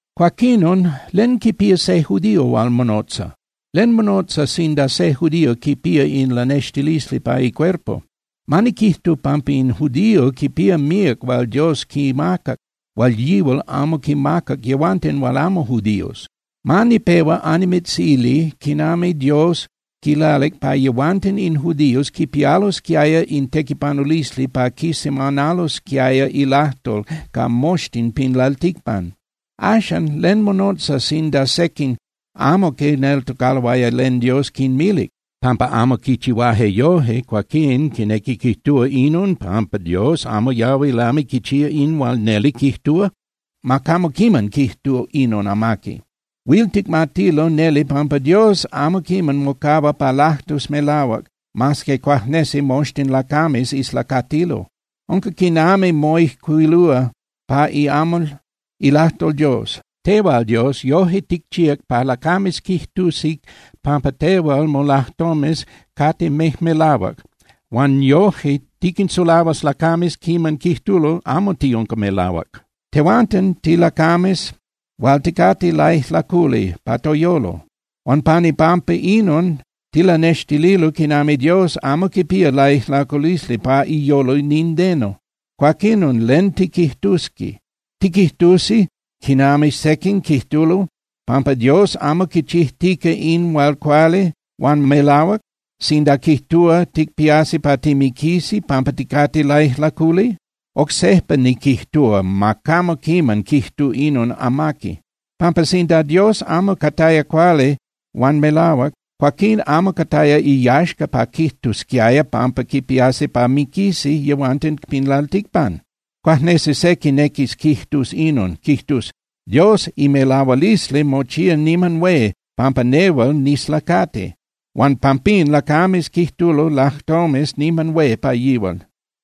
Cuaquinon, ¿len quipía se judío hual monotza? ¿Len monotza sinda se judío quipía in lanextilisli pa icuerpo? Ma niquijtu pampa in judío quipía míac hual Dios quimacac hual yihual amo quinmacac yehuanten hual amo judíos. Ma nipehua annimitzili quinami Dios quilalic pa yehuanten in judíos quipialosquiaya in tequipanulisli pa quisemanalosquiaya ilajtol ca moxtin pin lalticpan. Axan ¿len monotza sinda sequin amo quineltocaloaya len Dios quinmilic? Pampa amo quichihuaje yoje, cuaquín ¿quinequi quijtúa inon pampa Dios amo yahui lami quichía in hual neli quijtúa? ¡Ma camo quiman quijtu inon amaqui! Huil ticmatilo neli pampa Dios amo quiman mocahua pa lajtus melahuac, mas que cuajnesi moxtin lacames islacatilo. Unca quinami moijcuilúa pa iamal ilajtol Dios: Tehual, Dios, yoje ticchíac pa lacames quijtusi pampa tehual molajtomes cate mejmelahuac huan yoje tiquinsulahuas lacames quiman quijtulo amo tiunca melahuac. Tehuanten tilacames hual ticate laijlaculi pa toyolo, huan pan ipampa inon tilanextililo quinami Dios amo quipía laijlaculisli pa iyolo nindeno. Cuaquinon ¿len tiquijtusi? ¿Tiquijtusi quinami sequin quijtulo pampa Dios amo quichijtica in hual cuali huan melahuac sinda quijtúa ticpiasi pa timiquisi pampa ticate laijlaculi? Oc sejpa niquijtúa ¡ma camo quiman quijtu inon amaqui! Pampa sinda Dios amo cataya cuali huan melahuac, cuaquín amo cataya iyaxca pa quijtusquiaya pampa quipiasi pa miquisi yehuanten pin lalticpan. Cuajnesi se quinequis quijtus inon, quijtus: “Dios imelahualisli mochía niman hué pampa nehual nislacati, huan pampín lacames quijtulo lajtomes niman hué pa yihual.”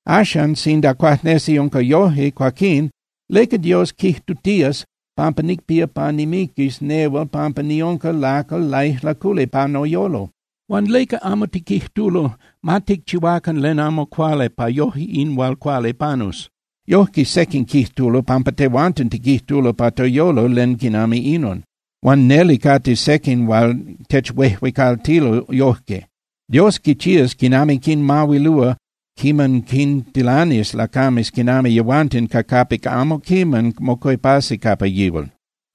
Axan, sinda cuajnesi unca yoje, cuaquín ¿leca Dios quijtutías pampa nicpía pa nimiquis nehual pampa niunca lacal laijlaculi pa noyolo? Huan ¿leca camo tiquijtulo: “Ma ticchihuacan len amo cuali pa yoje in hual cuali panus?” Yojque sequin quijtulo pampa tehuanten tiquijtulo pa toyolo len quinami inon. Huan neli cate sequin hual techuejuecaltilo yojque. Dios quichías quinami quinmahuilúa quiman quintilanis lacames quinami yehuanten ca capic amo quiman mocuepasi capa yihual.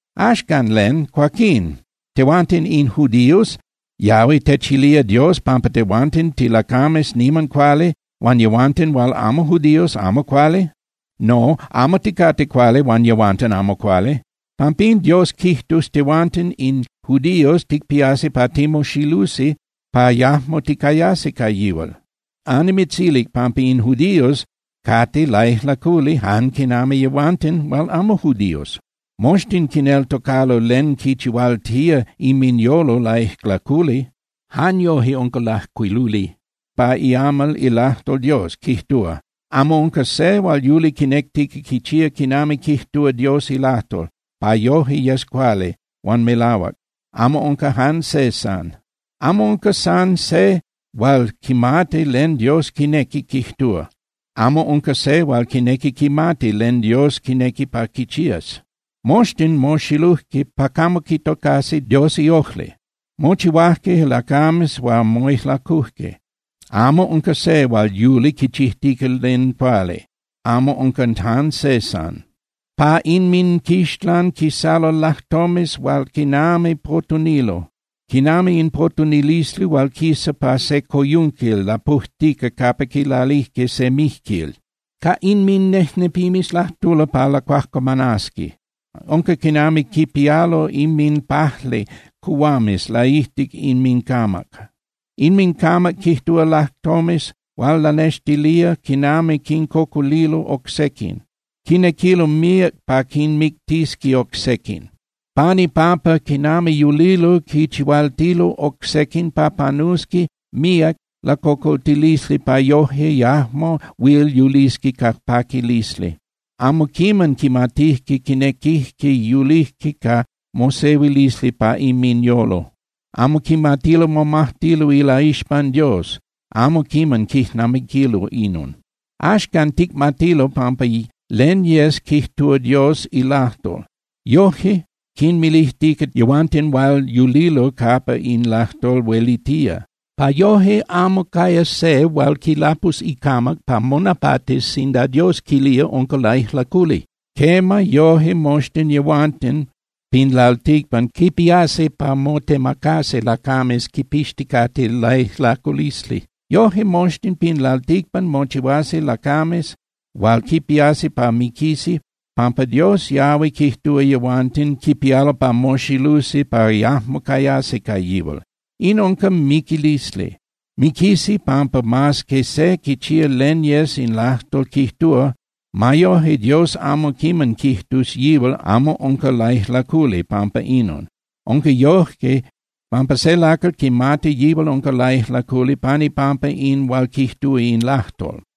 Axcan, ¿len, cuaquín? Tehuanten in judíos, ¿yahui techilía Dios pampa tehuanten tilacames niman cuali huan yehuanten hual amo judíos amo cuali? No, amo ticate cuali huan yehuanten amo cuali. Pampín Dios quijtus tehuanten in judíos ticpiasi pa timoxilusi pa yajmo ticayasi ca yihual. Annimitzilic pampa in judíos cate laijlaculi jan quinami yehuanten hual amo judíos. Moxtin quineltocalo len quinchihualtía inminyolo laijlaculi. Jan yoje unca lajcuiluli pa iamal ilajtol Dios, quijtúa: Amo unca se hual yuli quinectica quichía quinami quijtúa Dios ilajtol pa yoje yes cuali huan melahuac, amo unca jan se san. Amo unca san se hual quimati len Dios quinequi quijtúa, amo unca se hual quinequi quimati len Dios quinequi pa quichías. Moxtin moxilujque pa camo quitocasi Dios iojli, mochihuajque lacames hual moijlacujque. Amo unca se hual yuli quichijtica len cuali, amo unca jan se san. Pa inminquixlan quisalo lajtomes hual quinami potunilo, quinami in potunilisli hual quisa pa se coyunquil lapujtica capa quilalijque se mijquil. Ca inminejnepimes lajtulo pa lacuajcuamanasqui. Unca quinami quipialo inminpajli cuhuames laijtic inmincamac. Inmincamac quijtúa lajtomes hual lanextilía quinami quincocolilo oc sequin. Quinequilo míac pa quinmictisqui oc sequin. Pan ipampa quinami yulilo, quinchihualtilo oc sequin pa panusqui míac lacocoltilisli pa yoje yajmo huil yulisqui ca paquilisli. Amo quiman quimatijque quinequijque yulijque ca mosehuilisli pa inminyolo. Amo quimatilo momajtilo ilaixpan Dios, amo quiman quijnamiquilo inon. Axcan, ticmatilo pampa len yes quijtúa Dios ilajtol, yoje quinmilijtica yehuanten hual yulilo capa in lajtol huelitía, pa yoje amo cayas se hual quilapus icamac pa monapatis sinda Dios quilía unca laijlaculi. Quema, yoje moxtin yehuanten pin lalticpan quipiasi pa motemacasi lacames quipixticate laijlaculisli. Yoje moxtin pin lalticpan mochihuasi lacames hual quipiasi pa miquisi pampa Dios yahui quijtúa yehuanten quipialo pa moxilusi pa yajmo cayasi ca yihual. In unca miquilisli. Miquisi pampa mas que se quichía len yes in lajtol quijtúa, ma yoje Dios amo quiman quijtus yihual amo unca laijlaculi pampa inon. Unca yoje pampa se lacal quimati yihual unca laijlaculi pan ipampa in hual quijtúa in lajtol.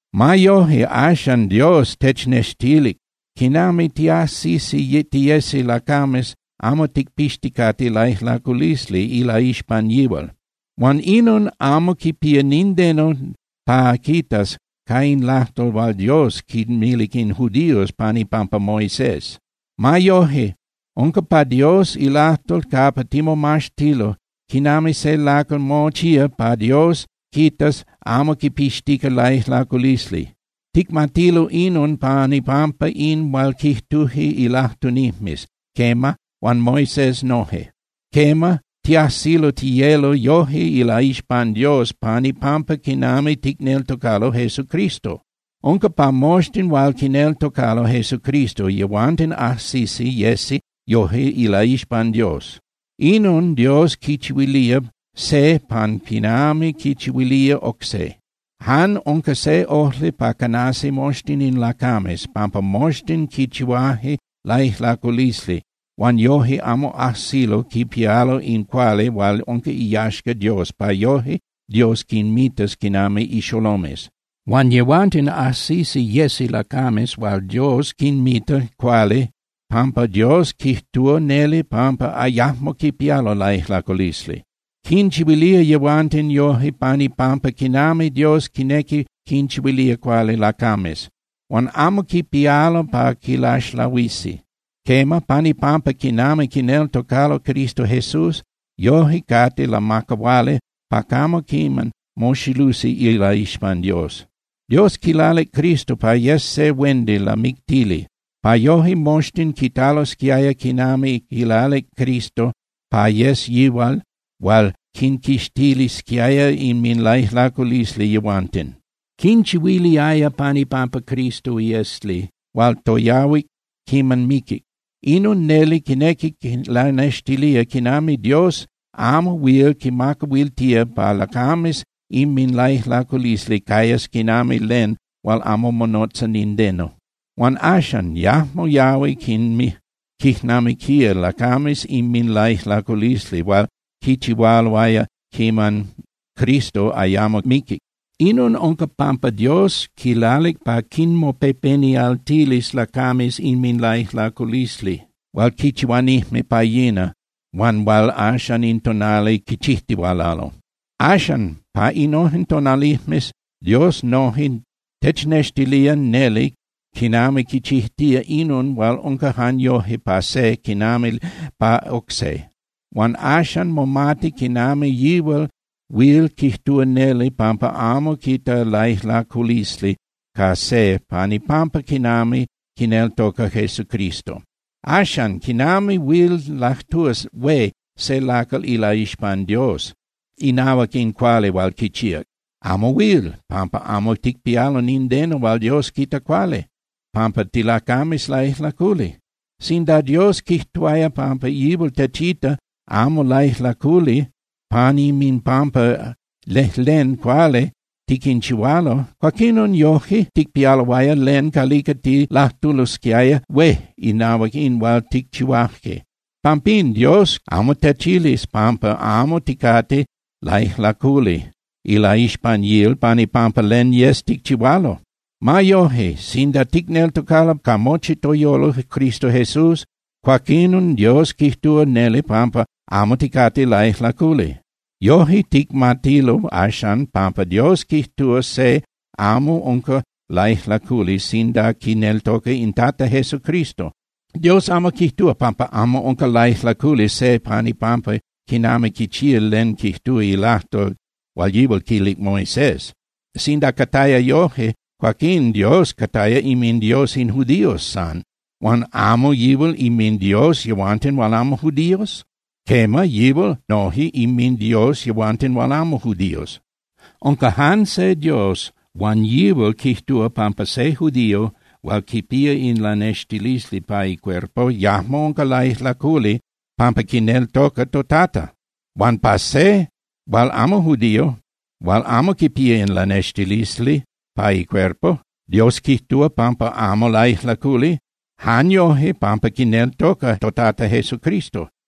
Ma yoje, axan Dios technextilic quinami tiajsisi tiyesi lacames amo ticpixticate laijlaculisli ilaixpan yihual. Huan inon amo quipía nindeno pa quitas ca in lajtol hual Dios quinmilic in judíos pan ipampa Moisés. Ma yoje, unca pa Dios ilajtol capa timomaxtilo quinami se lacal mochía pa Dios quitas amo quipixtica laijlaculisli. Ticmatilo inon pan ipampa in hual quijtuje ilajtunijmes, quema, huan Moisés noje. Quema, tiajsilo tiyelo yoje ilaixpan Dios pan ipampa quinami ticneltocalo Jesucristo. Unca pa moxtin hual quineltocalo Jesucristo, yehuanten ajsisi yesi yoje ilaixpan Dios. Inon Dios quichihuilía se jan quinami quichihuilía oc se. Jan unca se ojli pa canasi moxtin in lacames, pampa moxtin quichihuaje laijlaculisli huan yoje amo ajsilo quipialo in cuali hual unca iyaxca Dios pa yoje Dios quinmitas quinami ixolomes. Huan yehuanten ajsisi yesi lacames hual Dios quinmita cuali pampa Dios quijtúa neli pampa yajmo quipialo laijlaculisli. Quinchihuilía yehuanten yoje pan ipampa quinami Dios quinequi quinchihuilía cuali lacames. Huan amo quipialo pa quilaxlahuisi. Quema, pan ipampa quinami quineltocalo Cristo Jesús, yoje cate lamacahuali pa camo quiman moxilusi ilaixpan Dios. Dios quilalic Cristo pa yes se huendi lamictili, pa yoje moxtin quitalosquiaya quinami quilalic Cristo pa yes yihual hual quinquixtilisquiaya inminlaijlaculisli yehuanten. Quinchihuiliaya pan ipampa Cristo iesli hual toyahuic quiman miquic. Inon neli quinequi lanextilía quinami Dios amo huil quimacahuiltía pa lacames inminlaijlaculisli cayas quinami len hual amo monotza nindeno. Huan axan, yajmo yahui quijnamiquía lacames inminlaijlaculisli hual quichihualoaya quiman Cristo ayamo miquic. Inon unca pampa Dios quilalic pa quinmopepenialtilis lacames inminlaijlaculisli hual quinchihuanijme pa yina huan hual axan in tonali quinchijtihualalo. Axan pa innojen tonalijmes Dios noje technextilía neli quinami quichijtía inon hual unca jan yoje pa se quinami pa oc se. Huan axan momati quinami yihual huil quijtúa neli pampa amo quita laijlaculisli ca se pan ipampa quinami quineltoca Jesucristo. Axan, ¿quinami huil lajtúa hué se lacal ilaixpan Dios inahuac in cuali hual quichíac? Amo huil, pampa amo ticpialo nindeno hual Dios quita cuali, pampa tilacames laijlaculi. Sinda Dios quijtuaya pampa yihual techita amo laijlaculi pan inminpampa lejlen cuali tiquinchihualo, cuaquinon yoje ticpialoaya len calica tilajtulosquiaya hué inahuac in hual ticchihuaje. Pampín, Dios amo techilis pampa amo ticate laijlaculi ilaixpan yihual pan ipampa len yes ticchihualo. Ma yoje, sinda ticneltocalo ca mochi toyolo Cristo Jesús, cuaquinon Dios quijtúa neli pampa amo ticate laijlaculi. Yoje, ticmatilo axan pampa Dios quijtúa se amo unca laijlaculi sinda quineltoca in Tata Jesucristo. Dios amo quijtúa pampa amo unca laijlaculi se pan ipampa quinami quichía len quijtúa ilajtol hual yihual quilic Moisés. Sinda cataya yoje, cuaquín Dios cataya inminDios in judíos san. Huan ¿amo yihual inminDios yehuanten hual amo judíos? Quema, yihual noje inminDios yehuanten hual amo judíos. Unca jan se Dios huan yihual quijtúa pampa se judío hual quipía in lanextilisli pa icuerpo yajmo unca laijlaculi pampa quineltoca toTata. Huan pa se hual amo judío hual amo quipía in lanextilisli pa icuerpo, Dios quijtúa pampa amo laijlaculi jan yoje pampa quineltoca toTata Jesucristo.